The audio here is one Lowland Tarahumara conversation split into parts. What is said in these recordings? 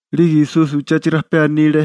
'Lige Esusi uché rajpé anile: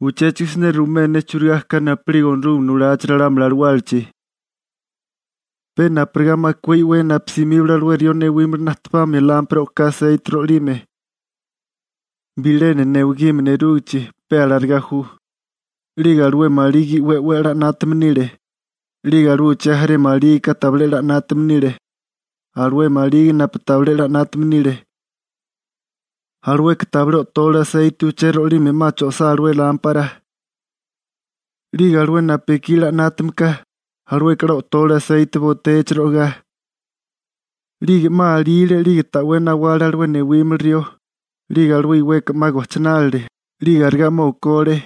―Uchéchigo siné ruimé ne churigá ka napu'lige Onorúgame nulachi ralámuli alawálachi. Pe napurigá makué i'wé napu simíbale alué rió newímili najtepamia lámpara o'ká aseite ro'ilime. Bilena newigime nerúgichi, pe alarigá ju. 'Lige alué maligi i'wé 'we a'lá 'nátame nile, 'lige alué uché jaré malígika tabilé 'la 'nátame nile. Alué maligi napu tabilé 'la 'nátame nile, alueka tabilé o'tole aseite uché ro'ilime 'ma cho'isá alué lámpara. 'Lige alué napu ekí 'la 'nátame ka, alueka 'la o'tole aseite botéachi ro'igá. 'Lige 'ma alíile 'lige ta'wé nawale alué newímili rió, 'lige alué iweka 'ma gojchinálile, 'lige arigá 'ma okole.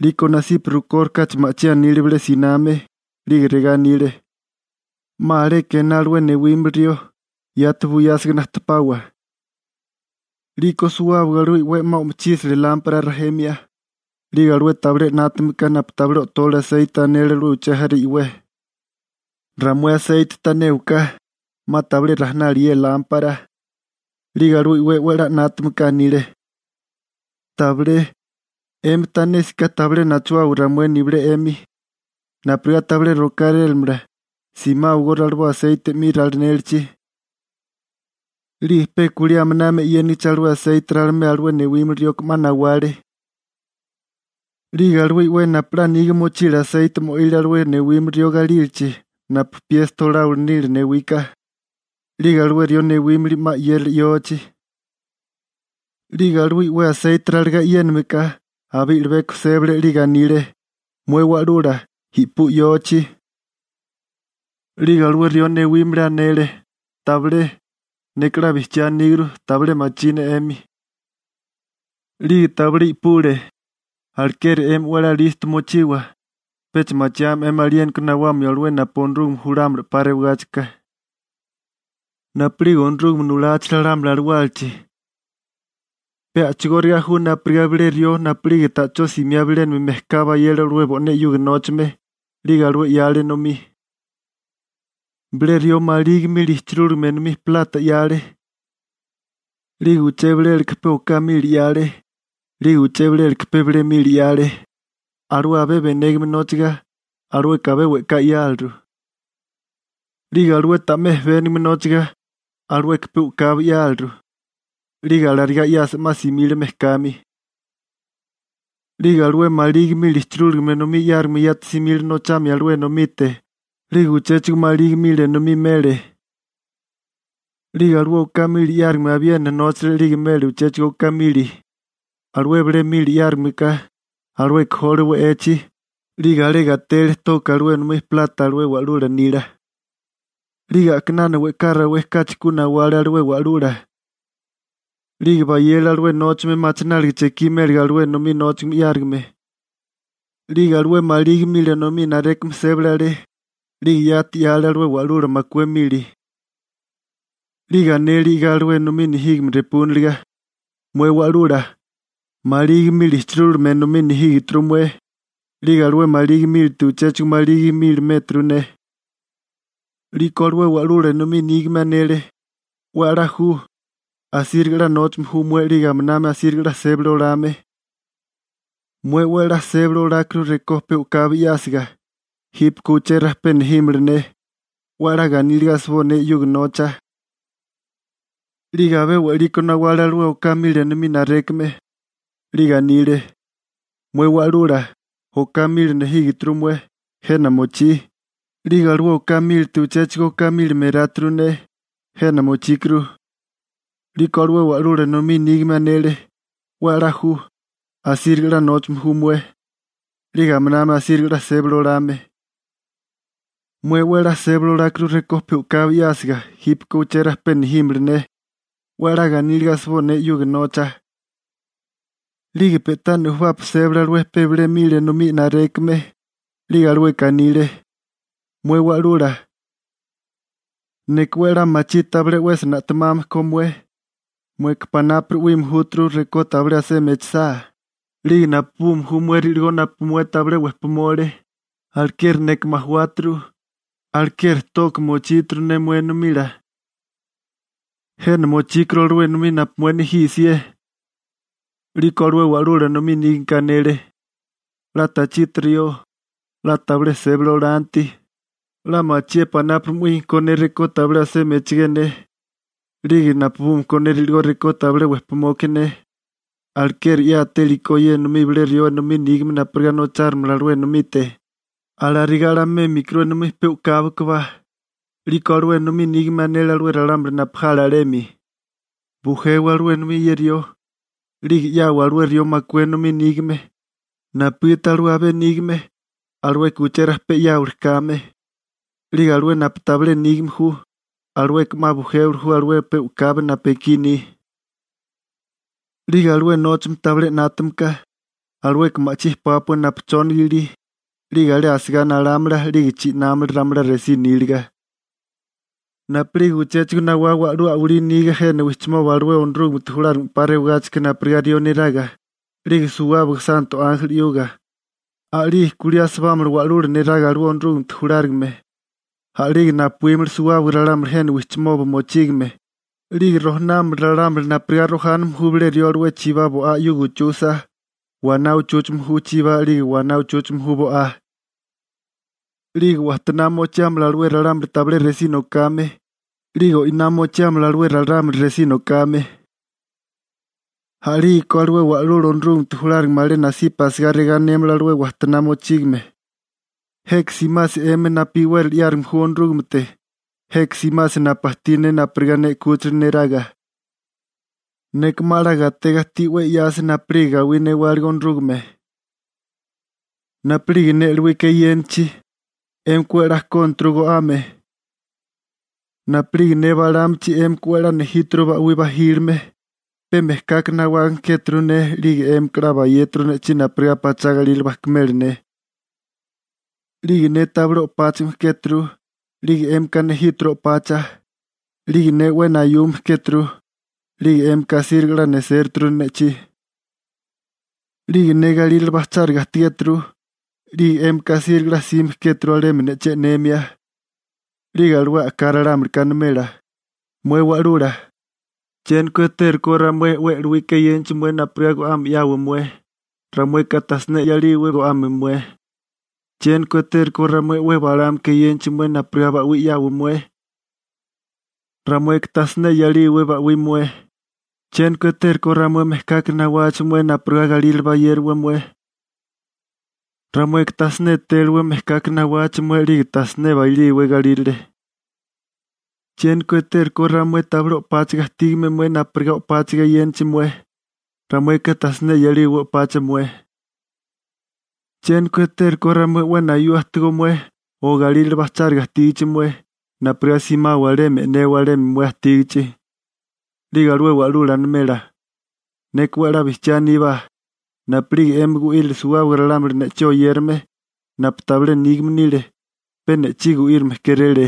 'Liko nasipa rukórikáchi ma'chí anile bilé siname, 'lige regá anile: «¡'Ma aleka ená alué newímili rió, yati buyásiga najtepawa!» 'Liko suwábaga alué i'wé 'ma o'mochísale lámpara rajemia. 'Lige alué tabilé 'la 'nátame napu tabilé o'tole aseite anele alué uché jarela i'wé: «Ramué aseite tanéwaká, 'ma tabilé rajinali ye lámpara.» 'Lige alué i'wé 'we a'lá 'nátame ka anile: «Tabilé, 'emi tanésiká tabilé nachuwawa ramué nibilé 'emi. Napurigá tabilé rokárélamala, simáwagó raliboa aseite 'mi ralinélichi.» 'Lige pe kulí a'minami e'yénigichi alué aseite ralimea alué newímili rioka 'ma nawale. 'Lige alué i'wé napu 'la niga mochile aseite mo'ile alué newímili rió galílachi napu piesta oláwili nile newika, 'lige alué rió newímili 'ma 'yérale yochi. 'Lige alué i'wé aseite ralagá e'yénameká, abé i'libeko sébale 'lige anile: «¡Mué Wa'lula, i'pú yochi!» 'Lige alué rió newímili anele: «Tabilé. Neka 'la bijchiá aníguru tabilé machí ne 'emi.» 'Lige tabilé i'pule. › Alekeri 'emi 'we a'lá listo mochiwa, pecha machiame 'emi aliéniko nawamio alué napu Onorúgame julámala 'pa rewagáchika. › Napu'lige Onorúgame nulachi ralámuli alawálachi, pe a'chigóriga ju napurigá bilé rió napu'lige ta'chó simiá bilénami mejká bayele alué bo'né 'yuga nóchame 'lige alué 'yale enomí. › Bilé rió maligi mili ijchirúlime enomí plata 'yale. 'Lige uché bilélaka pe oká mili 'yale. 'Lige uché bilélaka pe bilé mili 'yale. Alué abé benégame nóchaga, alueka abé we'ká 'yáleru. 'Lige alué ta'mé jebénigame nóchaga, alueka pe u'kabi 'yáliru. 'Lige alarigá 'yasa 'ma simile mejkami. 'Lige alué maligi mili ichirúlame enomí 'yárigame yati simile nochamia alué enomite, 'lige uchéchigo maligi mili enomí mele. 'Lige alué oká mili 'yárigame abiena nóchale 'lige mele uchéchigo oká mili. Alué bilé mili 'yárigame ka, alueka jole we'echi, 'lige alé gatele toka alué enomí plata alué wa'lula nila. › 'Lige a'kinana 'ma we'ká rawé kachi ku nawale alué wa'lula, 'lige bayele alué nóchame machináliga chekí méliga alué enomí nóchame 'yárigame. 'Lige alué maligi mili enomí narékame sébale alé, 'lige yati 'yale alué wa'lula makué mili. 'Lige anele i'gá alué enomí nejígame repúniliga: «Mué wa'lula, maligi mili ijchirúligame enomí nejígeturu mué, 'lige alué maligi mílite uchéchigo maligi mili mératuru ne.» 'Liko alué wa'lula enomí nígame anele: «'We a'lá ju, asíriga 'la nóchame ju mué 'lige aminami asíriga 'la sébali olame. Mué 'we a'lá sébali olákuru rekó pe u'kabi 'yásiga, jípeko uché rajpé nejímala ne, 'we a'lá ganíliga asiboa ne 'yuga nocha.» 'Lige abé we'liko nawale alué oká mili enomí narékame, 'lige anile: «Mué wa'lula, oká mili nejígeturu mué, jena mochí, 'lige alué oká mílite uchéchigo oká mili meráturu ne, jena mochíkuru.» 'Liko alué wa'lula enomí nígame anele: «'We a'lá ju, asíriga 'la nóchame ju mué, 'lige aminami asíriga 'la sébali olame. Mué 'we a'lá sébali olákuru rekó pe u'kabi 'yásiga, jípeko uché rajpé nejímala ne, 'we a'lá ganíliga asiboa ne 'yuga nocha.» 'Lige pe'tá nujubapi sébale alué pe bilé mili enomí narékame, 'lige alueka anile: «Mué wa'lula, neka 'we a'lá machí tabilé 'wesi na'temame ko mué, mueka panápuri 'wíime júturu rekó tabilé asemi echasá, 'lige napubume ju mué ri'ligó napu mué tabilé wejpimole. Alekeri neka majawáturu, alekeri toka mochíturu ne mué enomila. Jena mochíkuru alué enomí napu mué nejí 'sié.» 'Liko alué wa'lula enomí nígameka anele: «'La tachiti rió, 'la tabilé sébali olanti, 'la machié panápuri 'wíime ko ne rekó tabilé asemi echigé ne, 'lige napubume ko ne ri'ligó rekó tabilé wejpimoke ne. Alekeri 'yátéliko ye enomí bilé rió enomí nígame napurigá nochárimala alué enomite, alarigá 'la mémikuru enomí pe u'kabi kabá.» 'Liko alué enomí nígame anele alué ralámuli napu jale alemi: «Bujewa alué enomí ye rió, 'lige 'yawa alué rió makué enomí nígame, napugiti alué abé nígame, alueka uché rajpé 'yáwili kame, 'lige alué napu tabilé nígame ju, alueka 'ma bujéwili ju alué pe u'kabi napu ekí ni. 'Lige alué nóchame tabilé 'nátame ka, alueka ma'chí pápua chóniga ilígichi, 'lige alé asigá nalámala 'lige chi'námala ramalá resí níliga.» › Napu'lige uchéchigo nawá wa'lú a'walí niga jena wijchimoba alué Onorúgamete julárigame 'pa rewagáchika napurigá rió neraga, 'lige suwábaga santo ánjeli 'yuga, a'lige kulí asibámala wa'lula neraga alué Onorúgamete julárigame. A'lige napuímala suwábaga ralámuli jena wijchimoba mochígame, 'lige rojanámala ralámuli napurigá rojáname ju bilé rió alué chibá bo'á 'yuga uchusa, waná uchúchame ju chibá 'lige waná uchúchame ju bo'á. 'Lige wajtoná mochiámala alué ralámuli tabilé resí nokame, 'lige o'iná mochíamala alué ralámuli resí nokame. › A'lígeko alué Wa'lula Onorúgamete julárigame alé nasipa asigá regá anémala alué wajtoná mochígame: «Jeka simasi 'emi napu iwérali 'yárigame ju Onorúgamete. Jeka simasi napu ajtí ne napurigá ne 'kúchila neraga. Neka 'ma 'la gatega ajtí 'we 'yasi napu'lige gawí newálige Onorúgame. Napu'lige ne e'lowika eyénachi, 'émika 'we a'lá kónaturu go'ame. Napu'lige ne balámachi 'émika 'we a'lá nejíturu ba'wí bajílime. Pe mejkaka nawágame kéturu ne 'lige 'émika 'la bayéturu ne'chí napurigá pachá galírale bajkimela ne. 'Lige ne tabilé o'páchigime kéturu, 'lige 'émika nejíturu o'pacha. 'Lige ne 'we nayume kéturu, 'lige 'émika asíriga 'la nesératuru ne'chí. 'Lige ne galírale bajcháriga ajtigéturu, 'lige 'émika asíriga 'la jsime kéturu alemi ne'chí e'nemia.» 'Lige alué a'ká ralámulika animela: «Mué wa'lula, ¿chiéniko etérukó ramué 'we e'lowika eyénachi mué napurigá go'ame 'yawa mué? Ramueka tajsiné 'yalíwé go'ame mué. ¿Chiéniko etérukó ramué 'we balámaka eyénachi mué napurigá ba'wí 'yawa mué? Ramueka tajsiné 'yalíwé ba'wí mué. ¿Chiéniko etérukó ramué mejkaka nawachi mué napurigá galírale bayériwa mué? Ramueka tasiné etéliwé mejkaka nawachi mué 'lige ta siné bailíwé galírale. ¿Chiéniko etérukó ramué tabilé o'páchiga ajtígame mué napurigá o'pacha kógiwa? Ramueka tasiné 'yalíwé o'pacha mué. ¿Chiéniko etérukó ramué 'we nayua ajtigó mué o galírale bajcháriga ajtígichi mué napurigá simawa alemi e'newa alemi mué ajtígichi?» 'Lige alué wa'lula animela: «Neka 'we a'lá bijchiá aníbá, napu'lige 'emi gu'írile suwábaga ralámuli ne'chí oyérame, napu tabilé nígame nile, pe ne'chí gu'írime kéréle.» ›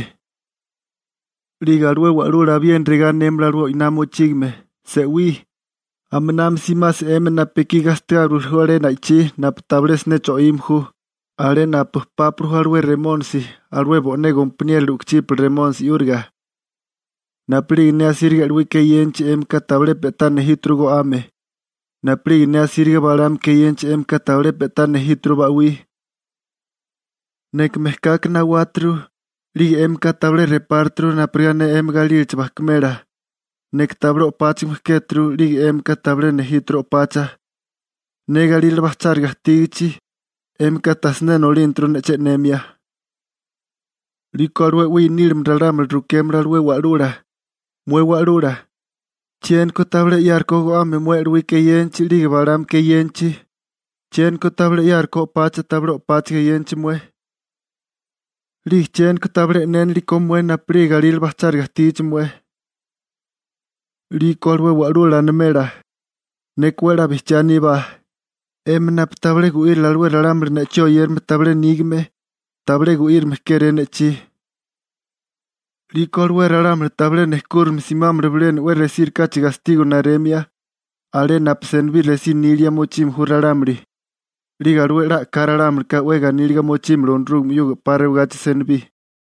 'Lige alué wa'lula abiena regá anémala alué o'iná mochígame: «Se'wí, a'minami simasi 'emi napu ekí gastigáriwili ju alé na'ichí napu tabilé siné cho'ime ju, alé napu pápili ju alué Remónisi alué bo'né gompaniérola u'kuchípala remónisi 'yúriga. Napu'lige ne asíriga e'lowika eyénachi 'émika tabilé pe'tá nejíturu go'ame. Napu'lige ne asíriga balámaka eyénachi 'émika tabilé pe'tá nejíturu ba'wí. Neka mejkaka nawáturu 'lige 'émika tabilé repáraturu napurigá ne 'emi galílachi bajkimela. Neka tabilé o'páchigime kéturu 'lige 'émika tabilé nejíturu o'pacha. Ne galírale bajcháriga ajtígichi, 'émika tajsiné nolínaturu ne'chí e'nemia.» 'Liko alué 'we i'nílime ralámuli rukémala alué wa'lula: «Mué Wa'lula, ¿chiéniko tabilé 'yárukó go'ame mué e'lowika eyénachi 'lige balámaka eyénachi? ¿Chiéniko tabilé 'yárukó o'pacha tabilé o'páchaga eyénachi mué? ¿'Lige chiéniko tabilé e'nénilekó mué napu'lige galírale bajcháriga ajtígichi mué?» 'Liko alué wa'lula animela: «Neka 'we a'lá bijchiá aníbá, 'emi napu tabilé gu'írile alué ralámuli ne'chí oyérame tabilé nígame, tabilé gu'írame kéré ne'chí.» 'Liko alué ralámuli tabilé nejkúrame simámala bilena 'we resírikáchi gastigo naremia, alé napu senibí resí nilia mochime ju ralámuli. 'Lige alué 'la a'ká ralámulika 'we ganíliga mochímala Onorúgame 'yuga 'pa rewagachi senibí.